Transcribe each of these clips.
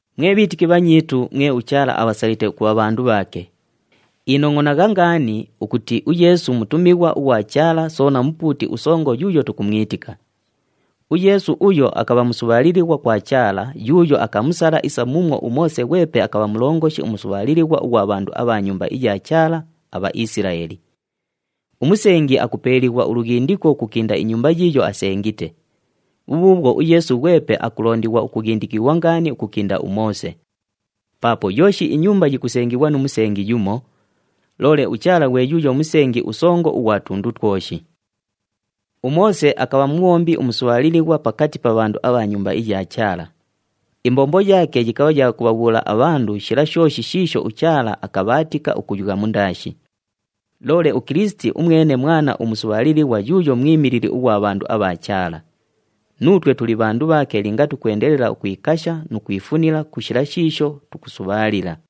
Mwe bhiitiki bhanyiitu, mwe uChaala abhasalite ukubha bhandu bhaake, inongʼonagha ngaani ukuti uYeesu mutumighwa ughwa Chaala soona Mupuuti uSongo yuuyo tukumwitika. UYeesu uyo akabha musubhaalilighwa kwa Chaala yuuyo akamusala isa muumwo uMoose ghwepe akabha mulongoshi umusubhaalilighwa ughwa bhandu abha nyumba iya Chaala, aBhaisilaeli. Umusengi akupeeliighwa ulughindiko ukukinda inyumba yiiyo asengite, bhubhuubhwo uYeesu ghwepe akulondighwa ukughindikighwa ngaani ukukinda uMoose. Paapo yooshi inyumba yikusengighwa nu musengi yumo, loole uChaala ghwe yuuyo Musengi uSongo ughwa tundu twoshi. UMoose akabha mubhombi umusubhaalilighwa pakati pa bhandu abha nyumba iya Chaala. Imbombo yaake yikabha ya kubhabhuula abhandu abho shila shooshi shiisho uChaala akabhaatika ukuyugha mundaashi. Loole uKilisiti umwene Mwana umusubhaalilighwa yuuyo mwimilili ughwa bhandu abha Chaala. Nuutwe tuli bhandu bhaake linga tukwendelela ukwikasha nu kwifunila ku shila shiisho tukusubhaalila.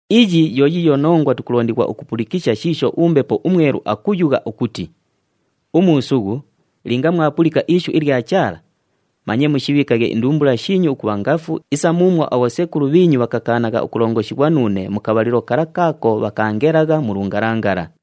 Iyi yo yiiyo nongwa tukulondighwa ukupulikisha shiisho uMbepo uMwelu akayugha ukuti, “Umuusughu, linga mwapulika ishu ilya Chaala, manye mushibhiikaghe indumbula shiinyu ukubha ngafu isa muumwo abhosekulu bhiinyu bhakakaanagha ukulongoshighwa nuune mu kabhalilo kala kaako bhakaangelagha mu lungalangala.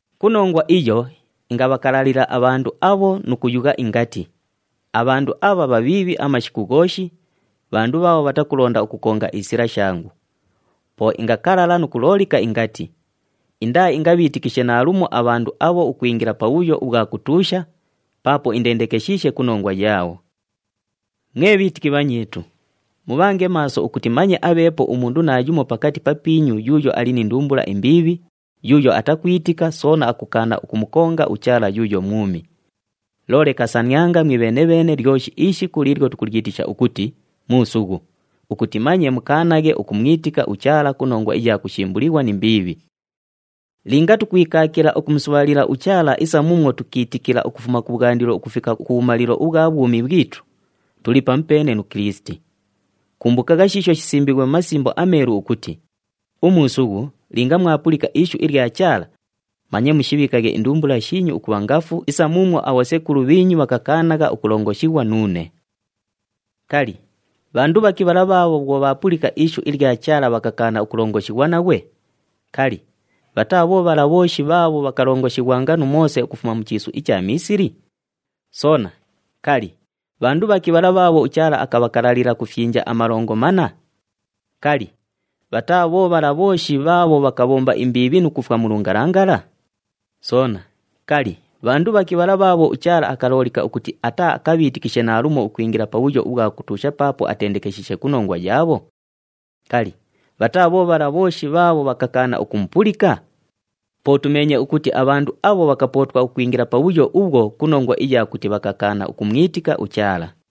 Ku nongwa iyo ingabhakalalila abhandu abho nu kuyugha ingati, ‘Abhandu abha bhabhiibhi amashiku ghooshi, bhandu bhaabho bhatakulonda ukukonga isila shangu.’ Po ingakalala nu kuloolika, ingati, ‘Indaaingabhiitikishe naalumo abhandu abho ukwingila pabhuyo ubhwa kutuusha, paapo indendekeshiishe ku nongwa yaabho.’” Mwe bhiitiki bhanyiitu, mubhange maaso ukuti manye abheepo umundu naayumo pakati papiinyu yuuyo ali ni ndumbula imbiibhi, yuuyo atakwitika, soona akukaana ukumukonga uChaala yuuyo mwumi. Loole kasanianga mwibheene-bheene lyoshi ishiku liilyo tukulyitisha ukuti, “Muusughu,” ukuti manye mukaanaghe ukumwitika uChaala ku nongwa iya kushimbulighwa ni mbiibhi. Linga tukwikaakila ukumusubhaalila uChaala isa muumwo tukiitikila ukufuma kubhwandilo ukufika kubhumalilo ubhwa bhwumi bhwitu, tuli pamupeene nu Kilisiti. Kumbukagha shiisho shisimbiighwe mu Masimbo aMeelu ukuti, “Umuusughu, linga mwapulika ishu ilya Chaala, manye mushibhiikaghe indumbula shiinyu ukubha ngafu isa muumwo abhosekulu bhiinyu bhakakaanagha ukulongoshighwa nuune.” Kali, bhandu bhaki bhala bhaabho bhwo bhaapulika ishu ilya Chaala bhakakaana ukulongoshighwa naghwe? Kali, bhataa bho bhala bhooshi bhaabho bhakalongoshighwanga nu Moose ukufuma mu chiisu icha Miisili? Soona, kali, bhandu bhaki bhala bhaabho uChaala akabhakalalila ku fyinja amalongo manna? Kali, bhataa bho bhala bhooshi bhaabho bhakabhomba imbiibhi nu kufwa mu lungalangala? Soona, kali, bhandu bhaki bhala bhaabho uChaala akaloolika ukuti ataaakabhiitikishe naalumo ukwingila pabhuyo ubhwa kutuusha paapo atendekeshiishe ku nongwa yaabho? Kali, bhataa bho bhala bhooshi bhaabho bhakakaana ukumupulika? Po tumeenye ukuti abhandu abho bhakapootwa ukwingila pabhuyo ubhwo ku nongwa iya kuti bhakakaana ukumwitika uChaala.